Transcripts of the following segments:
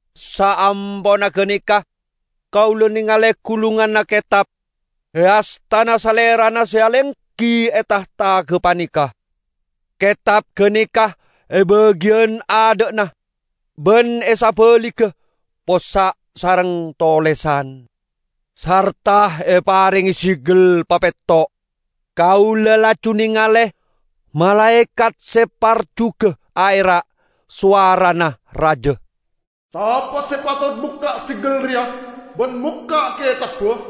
Saamponna ganeka kaula nengale gulunganna ketab e astana Salerana se alenggi e tahta gapaneka. Ketab ganeka e bagiyan adha'na ban e sabaligga possa' sareng tolesan, sarta eparenge segel papetto'. Kaula laju nengale malaekat se parjuga aera', sowarana raja, "Sapa se patot mokka' segel reya ban mokka' ketabba?"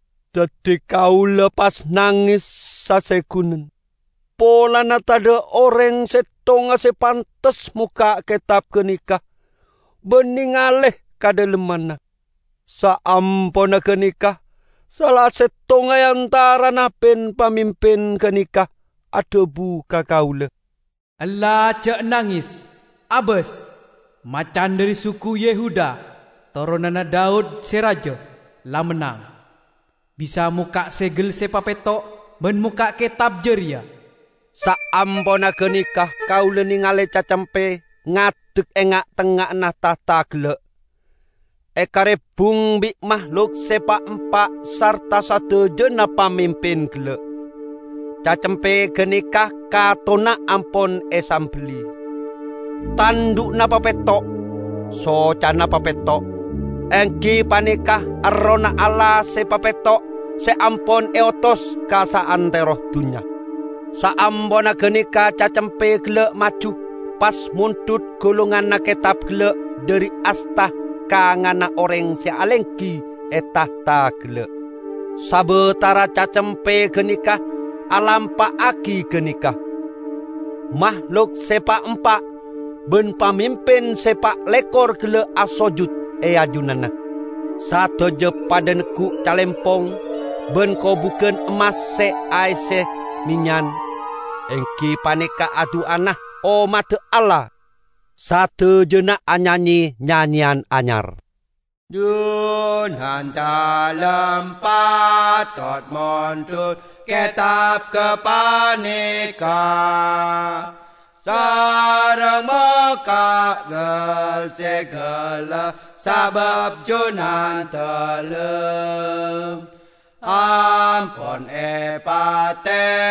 Daddi kaula pas nanges sasegunen polana tadha' oreng settonga se pantes mokka' ketab ganeka ban nengale ka dhalemmanna. Saamponna ganeka sala settong e antarana pin-pamimpin ganeka adhabu ka kaula, "Ella ja' nanges! Abas! Macan dhari suku Yehuda, toronanna Daud se raja, la mennang; bisa mokka' segel se papetto' ban mokka' ketab jareya." Saamponna ganeka kaula nengale Cacempe ngadek e nga'-tengnga'anna tahta gella', egaribbung bi' mahlok se pa'-empa' sarta sadajana pamimpin gella'. Cacempe ganeka katonna ampon esambelli. Tandhu'na papetto', socana papetto': enggi paneka errohna Allah se papetto' se ampon eotos ka saantero dunnya. Saamponna ganeka Cacempe gella' maju pas mondhut gulunganna ketab gella' dhari asta kanganna oreng se alenggi e tahta gella'. Sabatara Cacempe ganeka alampa'agi ganeka, mahlok se pa'-empa' ban pamimpin se pa' lekor gella' asojut e ajunanna. Sadaja padha neggu' calempong ban kobugan emmas se aesse mennyan, enggi paneka a-du'ana ommadda Allah. Sadajana anyanye nyanyeyan anyar "Junandalem patot mondhut ketab gapaneka, sareng mokka' gel-segella. Sabab Junandalem ampon epate'e,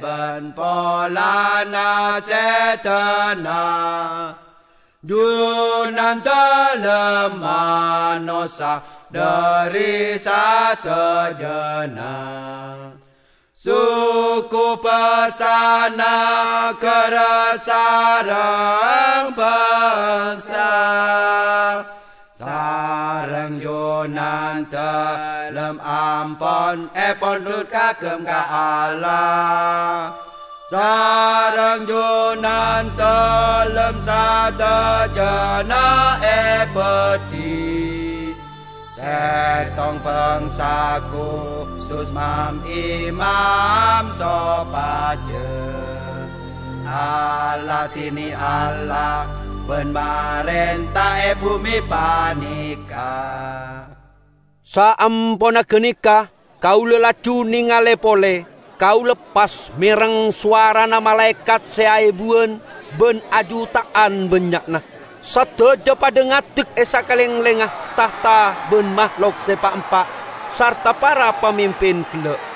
ban polana sedana Junandalem, manossa dhari sadajana suku, basa, nagara sareng bangsa, sareng Junandalem ampon epondhut kaagem ka Allah. Sareng Junandalem sadajana ebadhi settong bangsa kusus mam-imam, sopaja aladine Allah, ban marenta e bume paneka." Saamponna ganeka kaula laju nengale pole. Kaula pas mereng sowarana malaekat se aebuwan ban ajuta'an bannya'na. Sadaja padha ngadek e sakalenglengnga tahta ban mahlok se pa'-empa' sarta para pamimpin gella'.